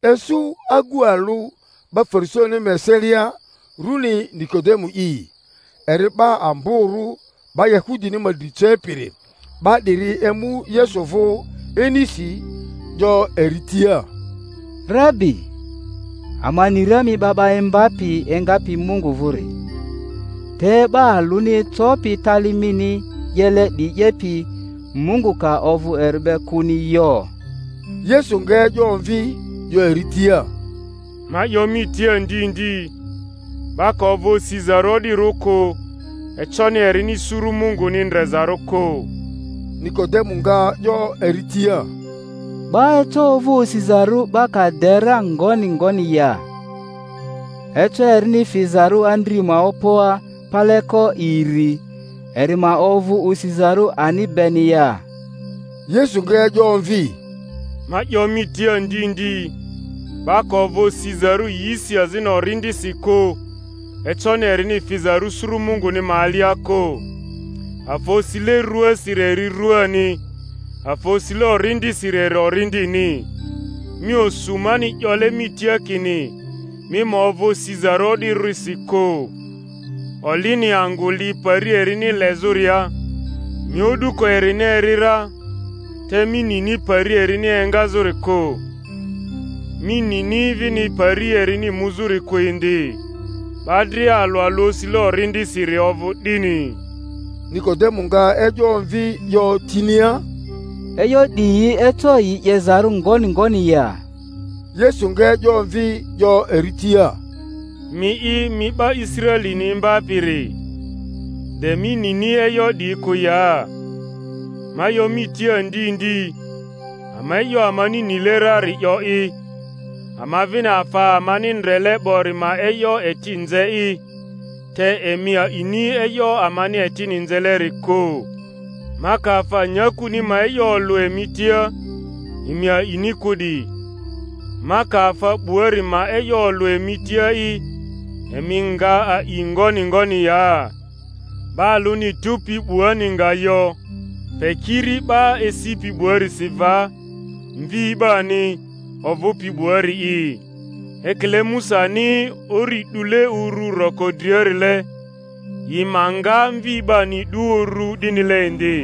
Isu agu alᴜ 'ba Farisaini ma eselia, runi Nikodemu'i, eri 'ba amborᴜ 'ba Yahudini ma dri cepiri. 'Ba 'diri emu Yesu vᴜ inisi, 'yo eri tia, Rabi, ama ni ra mi 'ba 'ba imbapi engapi Mungu vᴜri; te 'ba alᴜni ecopi tali mini 'yele 'diyi 'yepi, Mungu ka ovᴜ eri be kᴜni yo. Yesu nga e'yo omvi, 'yo eri tia, Ma 'yo mi tia ndi ndi, 'ba ka ovᴜ osizarᴜ o'dirᴜ kᴜ, econi erini suru Munguni ndrezarᴜ kᴜ. Niko-demu nga 'yo eri tia, 'Ba eco ovᴜ osizarᴜ 'ba ka de ra ngoni ngoni ya? Eco erini fizarᴜ andri ma opoa paleko iri, eri ma ovᴜ osizarᴜ ani beni ya? Yesu nga e'yo omvi, Ma 'yo mi tia ndi ndi, 'ba ka ovᴜ osizarᴜ yisi azini Orindisi kᴜ, econi erini fizarᴜ suru Munguni ma alia kᴜ. Afa osile ruasiri eri ruani, afa osile Orindisiri eri Orindini. Mi osu mani 'yole mi tia kini, Mi ma ovᴜ osizarᴜ o'dirᴜrisi kᴜ. Olini angᴜ li pari erini lezᴜria, mi o'duko erini eri ra, te mi nini pari erini engazᴜri kᴜ, mi nini vini pari erini muzᴜri kᴜ indi; 'ba dria alᴜ alᴜ osile Orindisiri ovᴜ 'dini. Nikodemo nga e'yo omvi 'yo tinia, E'yo 'diyi eco yi 'yezarᴜ ngoni ngoni ya? Yesu nga e'yo omvi 'yo eri tia, Mi'i mi 'ba Israelini imbapiri, de mi nini e'yo 'diyi kᴜ ya? Ma 'yo mi tia ndi ndi, ama e'yo amani nile rari 'yo'i, ama vini afa amani ndrele 'bori ma e'yo eti nze'i; te emi a'ini e'yo amani etini nzeleri kᴜ. Ma ka afa nyakuni ma e'yo olᴜ emi tia, emi a'ini kᴜ 'di; ma ka afa 'buari ma e'yo olᴜ emi tia'i, emi nga a'i ngoni ngoni ya? 'Ba alᴜni tupi 'buani nga yo, pe kiri 'ba esipi 'buarisi va, Mvi 'bani, ovᴜpi 'buari'i. Ekile Musani uri 'dule uru roko driarile, yi ma nga Mvi 'bani 'du uru 'dinile indi,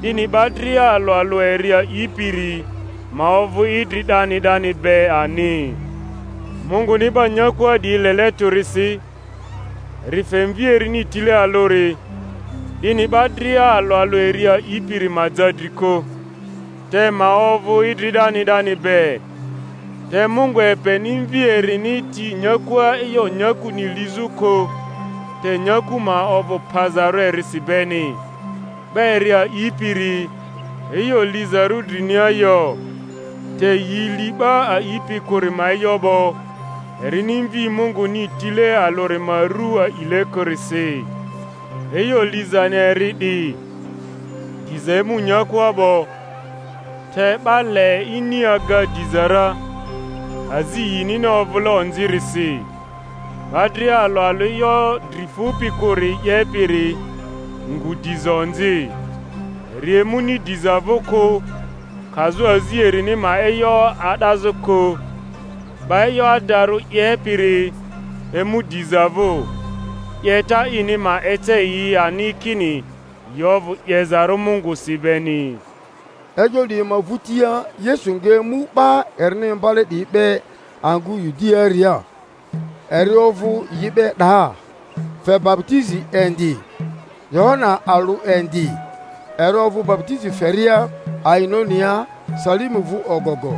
'dini 'ba dria alᴜ alᴜ eri a'ipiri ma ovᴜ idri 'dani 'dani be ani. Munguni 'ba nyakua 'diyi lele tᴜrisi, eri fe Mvi erini tile alᴜri, 'dini 'ba dria alᴜ alᴜ eri a'ipiri ma ja dri kᴜ, te ma ovᴜ idri 'dani 'dani be. Te Mungu epeni Mvi erini ti nyakua e'yo nyakuni lizᴜ kᴜ, te nyaku ma ovᴜ pazarᴜ erisi beni. 'Ba eri a'ipiri, e'yo lizarᴜ drinia yo; te yi li 'ba a'ipi kᴜri ma e'yo 'bo, erini Mvi Munguni tile alᴜri ma ru a'ile kᴜrisi. E'yo lizani eri 'di, diza emu nyakua 'bo, te 'ba le ini aga diza ra, azi yinini ovᴜle onzirisi. 'Ba dria alᴜ alᴜ e'yo dri fupi kᴜri 'yepiri ngu diza onzi, eri emuni diza vᴜ kᴜ, kazᴜ azi erini ma e'yo a'dazᴜ kᴜ. 'Ba e'yo adarᴜ 'ye-piri emu diza vᴜ, 'yeta ini ma ece yi ani kini yi ovᴜ 'yezarᴜ Mungusi beni. E'yo 'diyi ma vᴜtia Yesu nga emu 'ba erini imbale 'diyi be angᴜ Yudiaria; eri ovᴜ yi be 'daa, fe baputizi indi. Yohana alᴜ indi, eri ovᴜ baputizi feria Ainonia Salimu vᴜ ogogo,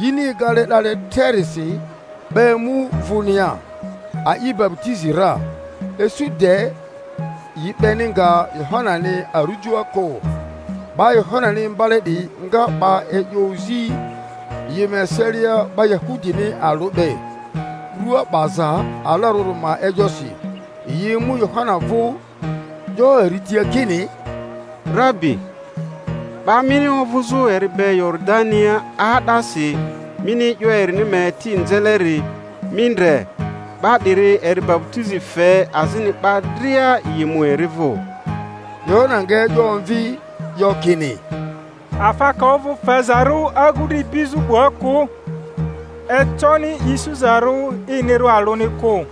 yini egale 'dale trerisi; 'ba emu vᴜmia, a'i baputizi ra. Isu de yi 'beni nga Yohanani arujoa kᴜ. 'Ba Yohanani imbale 'diyi nga 'ba e'yo ozi yi ma eselia 'ba Yahudini alᴜ be, rua 'baza alarᴜri ma e'yosi. Yi emu Yohana vᴜ, 'yo eri tia kini, Rabi, 'ba mini ovᴜzᴜ eri be Yoridania 'aa'dasi, mini e'yo erini ma eti nzeleri, mi ndre, 'ba 'diri eri baputizi fe, azini 'ba dria yi mu eri vᴜ. Yohana nga e'yo omvi, 'yo kini, Afa ka ovᴜ fezarᴜ agu dri ibizᴜ 'bua kᴜ, econi isuzarᴜ inirᴜ alᴜni kᴜ.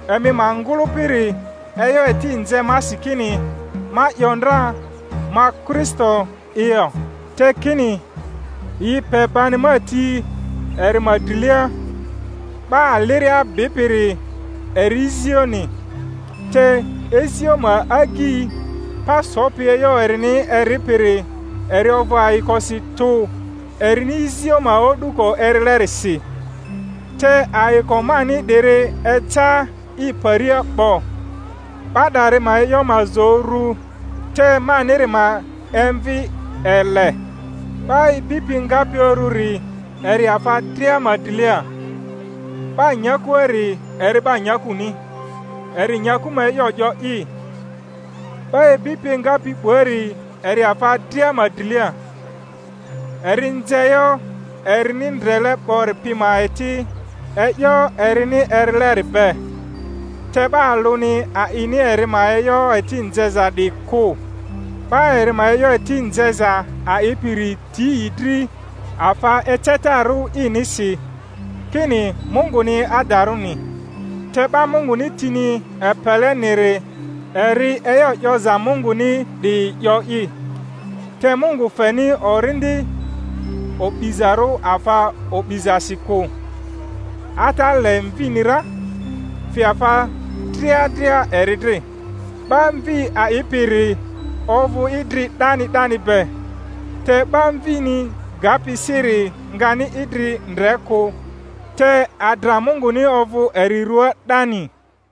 Emi ma ngᴜlᴜpiri e'yo eti nze masi kini ma 'yo ndra, Ma Kristo'i yo, te kini, Yi pe bani ma ti eri ma drilia. 'Ba aliria bipiri eri izioni; te izio ma agyi, pa sopi e'yo erini eripiri, eri ovᴜ ayikosi tᴜ erini izio ma o'duko erilerisi; te ayiko mani 'diri eca i paria 'bo. 'Ba 'dari ma e'yo ma zo uru, te maniri ma emvi ele. 'Ba ibipi engapi ururi eri afa dria ma drilia; 'ba nyakuari eri 'ba nyakuni, eri nyaku ma e'yo 'yo'i; 'ba ibipi engapi 'buari eri afa dria ma drilia. Eri nze e'yo erini ndrele 'bori pi ma eti e'yo erini erileri be, te 'ba alᴜni a'ini eri ma e'yo eti nzeza 'di kᴜ; 'ba eri ma e'yo eti nzeza a'ipiri ti i dri afa ecetarᴜ inisi, kini Munguni adarᴜni. Te 'ba Munguni tini epeleniri eri e'yo 'yoza Munguni 'diyi 'yo'i, te Mungu feni Orindi o'bizarᴜ afa o'bizasi kᴜ; Ata le Mvini ra, fe afa dria dria eri dri. 'Ba Mvi a'ipiri ovᴜ idri 'dani 'dani be; te 'ba Mvini gapi siri ngani idri ndre kᴜ, te adra Munguni ovᴜ eri ruaa 'dani.